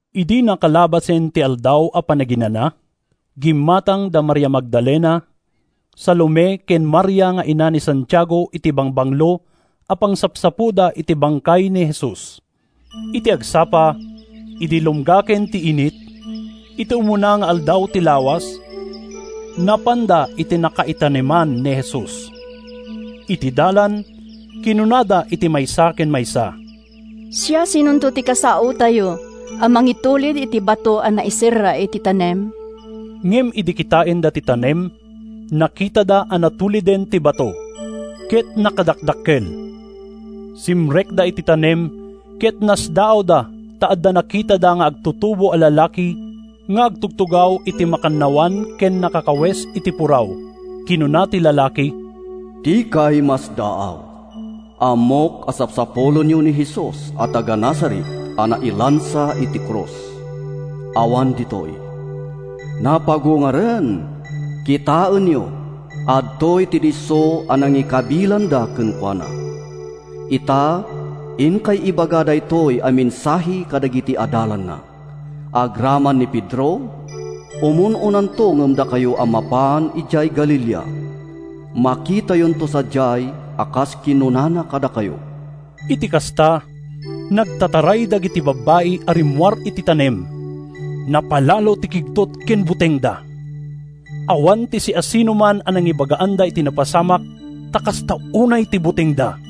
Idi nakalabasen ti Aldaw a Panaginana, gimmatang da Maria Magdalena, Salome ken Maria nga ina ni Santiago iti bangbanglo a pangsapsapoda iti bangkay ni Jesus. Iti agsapa, idi lumgaken ti init, iti umuna nga aldaw ti lawas, napanda iti nakaitaneman ni Jesus. Iti dalan, kinunada iti maysa ken maysa, “Siasinonto ti kasaotayo a mangitulid iti bato a naiserra iti tanem?” Ngem idi kitaenda ti tanem, nakitada a natuliden ti bato. Ket nakadakdakkel! Simrekda iti tanem ket nasdaawda ta adda nakitada nga agtutubo a lalaki nga agtugtugaw iti makannawan ken nakakawes iti puraw. Kinuna ti lalaki, “Dikay masdaaw! Ammok a sapsapulenyo ni Jesus a taga-Nazaret a nailansa iti krus. Awan ditoy. Napagungaren! Kitaenyo, adtoy ti disso a nangikabilanda kenkuana. Ita, inkay ibaga daytoy a mensahe kadagiti adalanna, agraman ni Pedro: ‘Umun-unanto ngem dakayo a mapan idiay Galilea. Makitayonto sadiay a kas kinunana kadakayo.’” Iti kasta, nagtataray dagiti babbai a rimmuar iti tanem. Napalalo ti kigtot ken butengda. Awan ti siasinoman a nangibagaanda iti napasamak ta kasta unay ti butengda.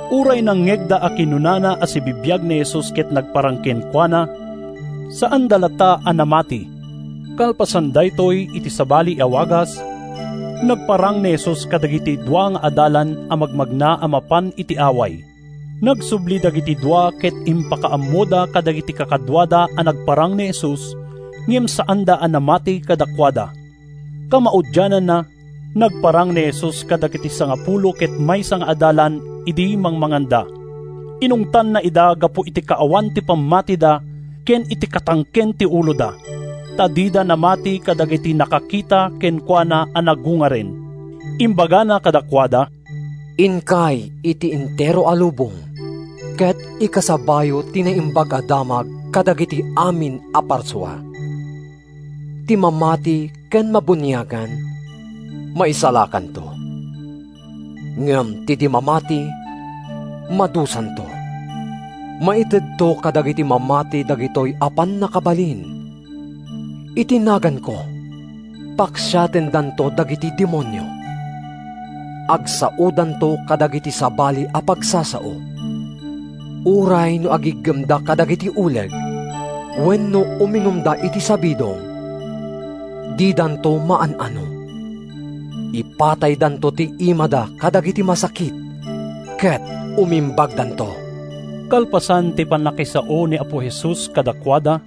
Uray nangngegda a kinunana a sibibiag ni Jesus ken nagparang kenkuana, saanda latta a namati. Kalpasan daytoy, iti sabali a wagas, nagparang ni Jesus kadagiti dua nga adalan a magmagna a mapan iti away. Nagsubli dagiti dua ket impakaammoda kadagiti kakaduada a nagparang ni Jesus, ngem saanda a namati kadakuada. Kamaudiananna, nagparang ni Jesus kadagiti sangapulo ket maysa nga adalan idi mangmanganda. Inungtanna ida gapu iti kaawan ti pammatida ken iti katangken ti uloda, ta dida namati kadagiti nakakita kenkuana a nagungaren. Imbagana kadakuada: “Inkay iti entero a lubong ket ikasabayo ti Naimbag a Damag kadagiti amin a parsua. Ti mamati ken mabuniagan, maisalakanto. Ngem ti di mamati, madusanto. Maitedto kadagiti mamati dagitoy a pannakabalin: Iti naganko, paksiatendanto dagiti demonio. Agsaodanto kadagiti sabali a pagsasao. Uray no agiggemda kadagiti uleg, wenno uminumda iti sabidong, didanto maan-ano. Ipataydanto ti imada kadagiti masakit ket umimbagdanto.” Kalpasan ti pannakisao ni Apo Jesus kadakuada,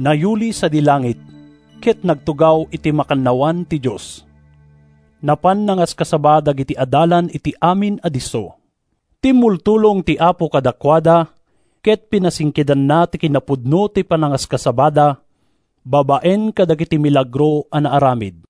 nayuli sadi langit, ket nagtugaw iti makannawan ti Dios. Napan nangaskasaba dagiti adalan iti amin a disso. Timmultulong ti Apo kadakuada ket pinasingkedanna ti kinapudno ti panangaskasabada babaen kadagiti milagro a naaramid.